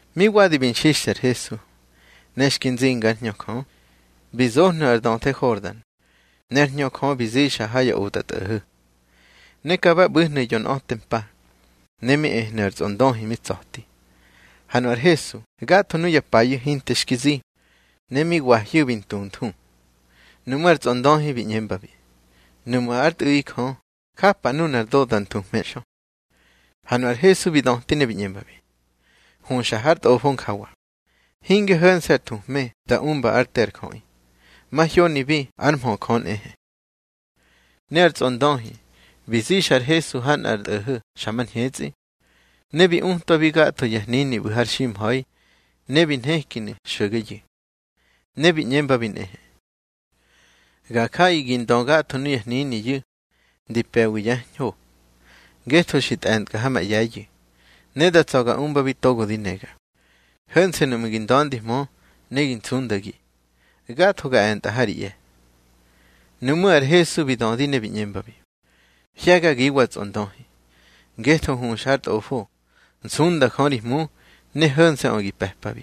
Mi wadi bi nxixthe ar Hesu, ne xki nzinga ár Hñö Jö, bi zohnu̱ ar döthe Hordan, ne ár Hñö Jö bi zixa ha ya otꞌatꞌo̱ho̱. Ne ka ba ꞌbu̱hnu̱ yonꞌa̱te mpa, ne mi ehnu̱ ar tsꞌondöhi mi tsa̱ti. Ha nu ar Hesu gatho nuya payu̱ hinte xki zi, ne mi wahyu̱ bi ntunthu. Nuꞌmú̱ ar tsꞌondöhi bi ꞌñembabi: —Nuꞌmu̱ ár Tꞌu̱ꞌi Jö, japa nunar do da nthuhme xö. Ha nu ar Hesu bi döti ne bi ꞌñembabi: —Huxa har Tꞌofo njawa: Hinge ho̱nse̱ ar thuhme da umba ár te ar jöꞌi, mahyonibi ár mhö Jö nꞌehe. Ne ar tsꞌondöhi bi zixa ar Hesu ha nꞌar tꞌo̱ho̱ xa mar ñhetsꞌi, ne bi utwabi gatho ya hnini ꞌbu̱ har ximha̱i, ne bi nhekinu̱ xo̱geyu̱. Ne bi ꞌñembabi nꞌehe: —Ga jaꞌi gi ndö gatho nuya hniniyu̱, di pe̱wi yá ñho, ngetho xi tꞌe̱ntkꞌa ha ma ꞌye̱yu̱, ne da tsa̱ ga umbabi togo di nega. Ho̱nse̱ nuꞌmu̱ gi nda̱ndihmö ne gi nsundagi, gatho ga e̱ntꞌa ha ri ꞌye̱. Nuꞌmú̱ ar Hesu bi dödi ne bi ꞌñembabi: —Hye̱gagiwa tsꞌondöhi. Ngetho huxa har Tꞌofo: Nsunda Jö ri Hmu, ne ho̱nse̱ꞌö gi pe̱pabi.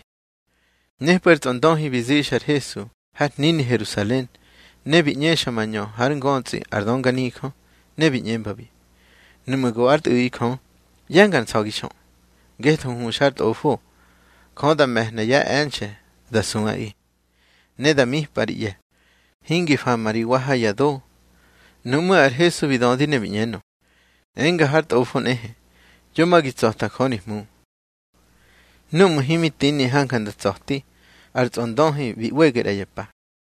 Nepꞌu̱ ar tsꞌondöhi bi zixa ar Hesu har hnini Herusalen, ne bi ꞌñexa mañö hár ngötsꞌi ar dönganijö, ne bi ꞌñembabi: —Nuꞌmu̱ go ár Tꞌu̱ꞌi Jö, ꞌye̱ngar nsa̱gi xö. Ngetho huxa har Tꞌofo: Jö da me̱hna yá e̱nxe̱ da suꞌaꞌi. Ne da mipꞌa ri ꞌye̱, hingi fama ri wa ha ya do. Nuꞌmú̱ ar Hesu bi dödi ne bi ꞌñenö: —Enga har Tꞌofo nꞌehe: Yo ma gi tsa̱ta Jö ri Hmu. Núꞌmu̱ himi tini hanja nda tsa̱ti, ar tsꞌondöhi bi ꞌwege ꞌra ya pa.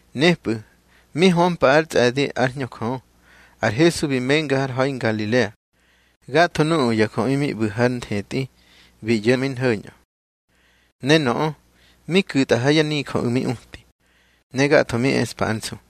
Nepꞌu̱ mi hömpa ár tsꞌe̱di ár Hñö Jö, ar Hesu bi menga har ha̱i Ngalilea. Gatho nuꞌu̱ ya jöꞌi mi ꞌbu̱ hár nthetꞌi bi ꞌyo̱ mi nho̱ñꞌö. Ne nöꞌö mi ku̱tꞌa ha yá nijöꞌu̱ mi uti. Ne gatho mi eꞌspa ár nsu.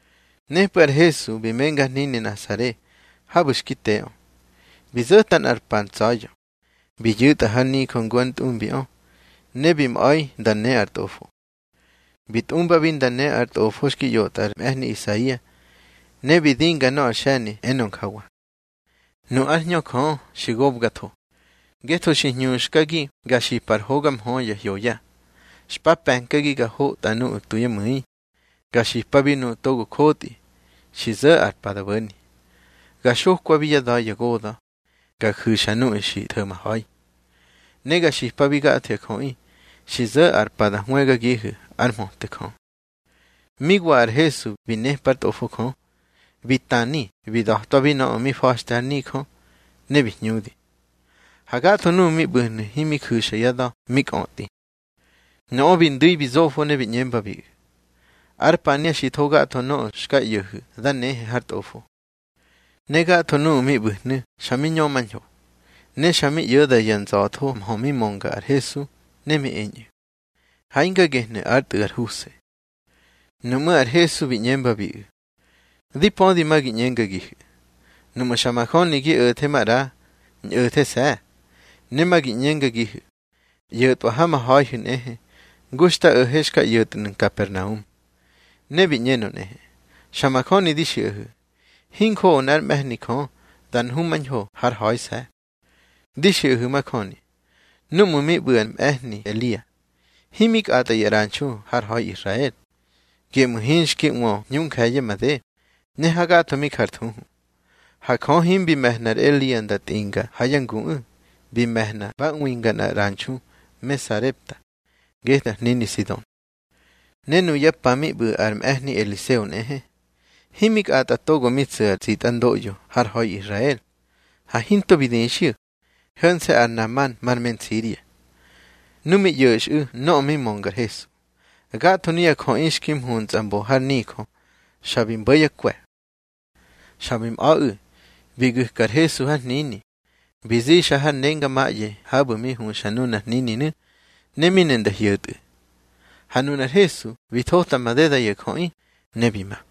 Nepꞌu̱ ar Hesu bi menga har hnini Nasare habu̱ xki teꞌö. Bi zo̱ta nꞌar pa ntsa̱ya̱, bi yu̱tꞌa har nijö ngu ár ntꞌumbiꞌö, ne bi mꞌa̱i nda né ar Tꞌofo. Bi tꞌumbabi nda ne ar tꞌofo xki ꞌyotꞌa ar mꞌe̱hni Isaia, ne bi dinga nöꞌö ar xe̱ni enö njawa: Nu ár Hñö Jö xi gobgatho, ngetho xi hñuxkagi ga xipa ar hoga mhö ya hyoya. Xpa pe̱nkagi ga hotꞌa nuꞌu̱ tu yá mu̱i, ga xipabi nuꞌu̱ togo jotꞌi, xi zo̱ ar pa da bo̱ni, ga xokwabi yá da̱ ya goda̱, ga ju̱xa nuꞌu̱ xi tho̱maha̱i. Ne ga xipabi gatho ya jöꞌi xi zo̱ ar pa da hwëgagihu̱ ár mhöte Jö. Mi wa ar Hesu bi nepa ár Tꞌofo Jö, bi tani bi da̱twabi nöꞌö mi fa̱xte har nijö, ne bi hñudi. Ha gatho nuꞌu̱ mi ꞌbu̱hnu̱ himi ju̱xa yá da̱ mi kꞌötꞌi. Nöꞌö bi ndu̱i bi zofo, ne bi ꞌñembabiꞌu̱: —Ar pania xi tho gatho nöꞌö xka ꞌyo̱hu̱ da nehe har Tꞌofo. Ne gatho nuꞌu̱ mi ꞌbu̱hnu̱ xa mi ñömañho, ne xa mi ꞌyo̱da ya nza̱tho mhö mi mönga ar Hesu, ne mi eñꞌu̱: —Ha hinga gehnu̱ ár tꞌu̱ ar Huse. Nuꞌmú̱ ar Hesu bi ꞌñembabiꞌu̱: —Di pödi ma gi ꞌñengagihu̱: Nuꞌmu̱ xa majöni gi o̱the maꞌra, ñꞌo̱these̱. Ne ma gi ꞌñengagihu̱: ꞌYo̱tꞌwa ha ma ha̱ihu̱ nꞌehe, ngu xta o̱he xka ꞌyo̱tnu̱ Nkapernaum. Ne bi ꞌñenö nꞌehe: —Xa majöni di xiꞌahu̱, hinjoꞌo nꞌár mꞌe̱hni Jö da nhumañho hár ha̱ise̱. Di xiꞌahu̱ majöni, núꞌmu̱ mi ꞌbu̱ ar mꞌe̱hni Elia, himi kꞌatꞌa ya ꞌranxu har ha̱i Israel, geꞌmu̱ hinxki ꞌwö hñu nje̱ye̱ made, ne hagatho mi jar thuhu. Ha Jö himbi me̱hna ar Elia nda tꞌinga ha yá nguꞌu̱. Bi me̱hna ba ꞌwinga nꞌar ꞌranxu me Sarepta, getꞌu̱ ar hnini Sidon. Ne nuya pa mi ꞌbu̱ ar mꞌe̱hni Eliseo nꞌehe, himi kꞌatꞌa togo mi tsu̱ ar tsitꞌandoꞌyo har ha̱i Israel, ha hinto bi dixyu̱, ho̱nse̱ ar Naman mar me Nsiria. Nu mi ꞌyo̱xꞌu̱ nöꞌö mi mönga ar Hesu, gatho nuya jöꞌi xki mhuntsꞌa mbo har nijö xa bi mbo̱ yá kwe̱. Xa bi mꞌa̱ꞌu̱, bi gu̱ka ar Hesu har hnini, bi zixa har nengamaꞌye habu̱ mi huxa nunar hnininu̱, ne mi ne nda hyo̱tꞌu̱. Ha nunar Hesu bi thota madeda ya jöꞌi, ne bi ma.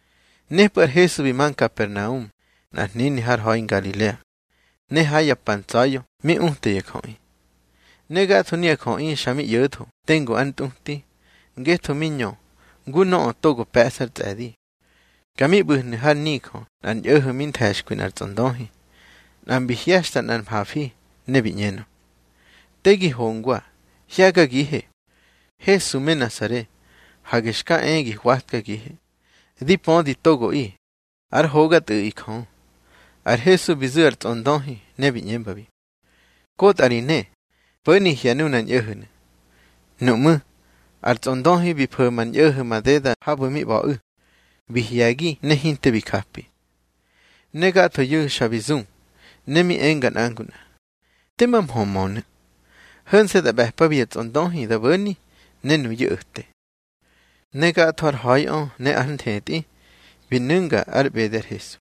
Nepꞌu̱ ar Hesu bi ma Nkapernaum, nꞌar hnini har ha̱i Ngalilea, ne ha ya pa ntsa̱ya̱ mi uta ya jöꞌi. Ne gatho nuya jöꞌi xa mi ꞌyo̱tho tengu ár ntꞌuti, ngetho mi ñö ngu nöꞌö togo pe̱ꞌsa ar tsꞌe̱di. Ka mi ꞌbu̱hnu̱ har nijö nꞌar ñꞌo̱ho̱ mi nthe̱xkwi nꞌar tsꞌondöhi. Nꞌa mbi hye̱xta nꞌar mhafi, ne bi ꞌñenö: —Te gi hongwa. Hye̱gagihe, Hesu me Nasare. Hage xka e gi hwatkagihe. Di pödi togoꞌi, ár hoga Tꞌu̱ꞌi Jö. Ar Hesu bi zu̱ ar tsꞌondöhi, ne bi ꞌñembabi: —Kotꞌa ri ne, po̱ni hye̱ nunar ñꞌo̱ho̱nu̱. Nuꞌmú̱ ar tsꞌondöhi bi fo̱ma ar ñꞌo̱ho̱ madeda habu̱ mi ꞌba̱ꞌu̱, bi hye̱gi ne hinte bi japi. Ne gathoyu̱ xa bi zu, ne mi enga nꞌa ngu nꞌa: —Tema mhö mönu̱. Ho̱nse̱ da ꞌbe̱pabi ya tsꞌondöhi da bo̱ni, ne nuyu̱ o̱te. Ne gatho har ha̱iꞌö ne ár nthetꞌi bi nu̱nga ár ꞌbede ar Hesu.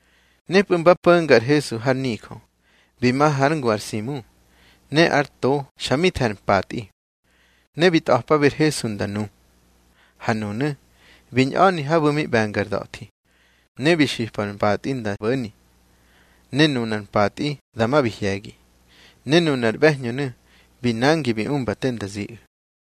Nepꞌu̱ mba po̱nga ar Hesu har nijö, bi ma hár ngu ar Simu. Ne ár to xa mi the̱ ar mpatꞌi. Ne bi tꞌa̱pabi ar Hesu nda nu. Ne nunu̱ bi ñꞌani habu̱ mi ꞌbe̱nga ar da̱thi, ne bi xipa ar mpatꞌi nda bo̱ni. Ne nunar mpatꞌi dama bi hye̱gi, ne nunar ꞌbe̱hñönu̱ bi nangi bi umba te nda ziꞌu̱.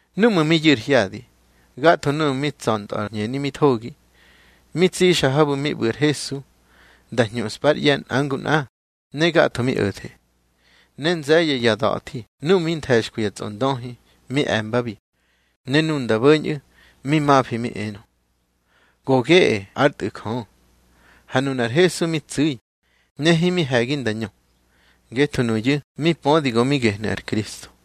Núꞌmu̱ mi yu̱ ar hyadi, gatho nuꞌu̱ tsa̱ntꞌö ar hñeni mi thogi, mi tsꞌixa habu̱ mi ꞌbu̱ ar Hesu nda hñuꞌspa ár ꞌye̱ nꞌa ngu nꞌa, ne gatho mi o̱the. Ne nze̱ye̱ ya da̱thi nuꞌu̱ mi nthe̱xkwi ya tsꞌondöhi mi e̱mbabi, ne nu nda bo̱ñꞌu̱, mi mafi mi enö: —Go geꞌe ár Tꞌu̱ Jö. Ha nunar Hesu mi tsu̱i, ne himi he̱gi nda ñö, ngetho nuyu̱ mi pödi go mi gehnu̱ ar Kristo.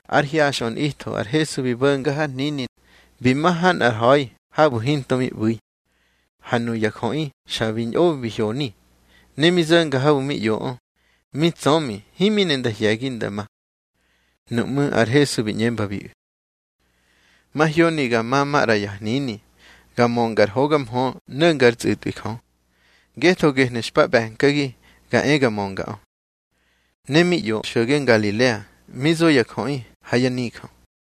Ár hyaxꞌö nꞌitho ar Hesu bi bo̱nga har hnini, bi ma ha nꞌar ha̱i habu̱ hinto mi ꞌbu̱i. Ha nuya jöꞌi xa bi ñꞌo bi hyoni, ne mi zo̱nga habu̱ mi ꞌyoꞌö, mi tsömi himi ne nda hye̱gi nda ma. Nuꞌmú̱ ar Hesu bi ꞌñembabiꞌu̱: —Mahyoni ga ma maꞌra ya hnini, ga mönga ar hoga mhö no̱nga ár tsꞌu̱tꞌwi Jö, ngetho gehnu̱ xpa ꞌbe̱nkagi ga e ga möngaꞌö. Ne mi ꞌyo xo̱ge Ngalilea, mi zo ya jöꞌi ha yá nijö.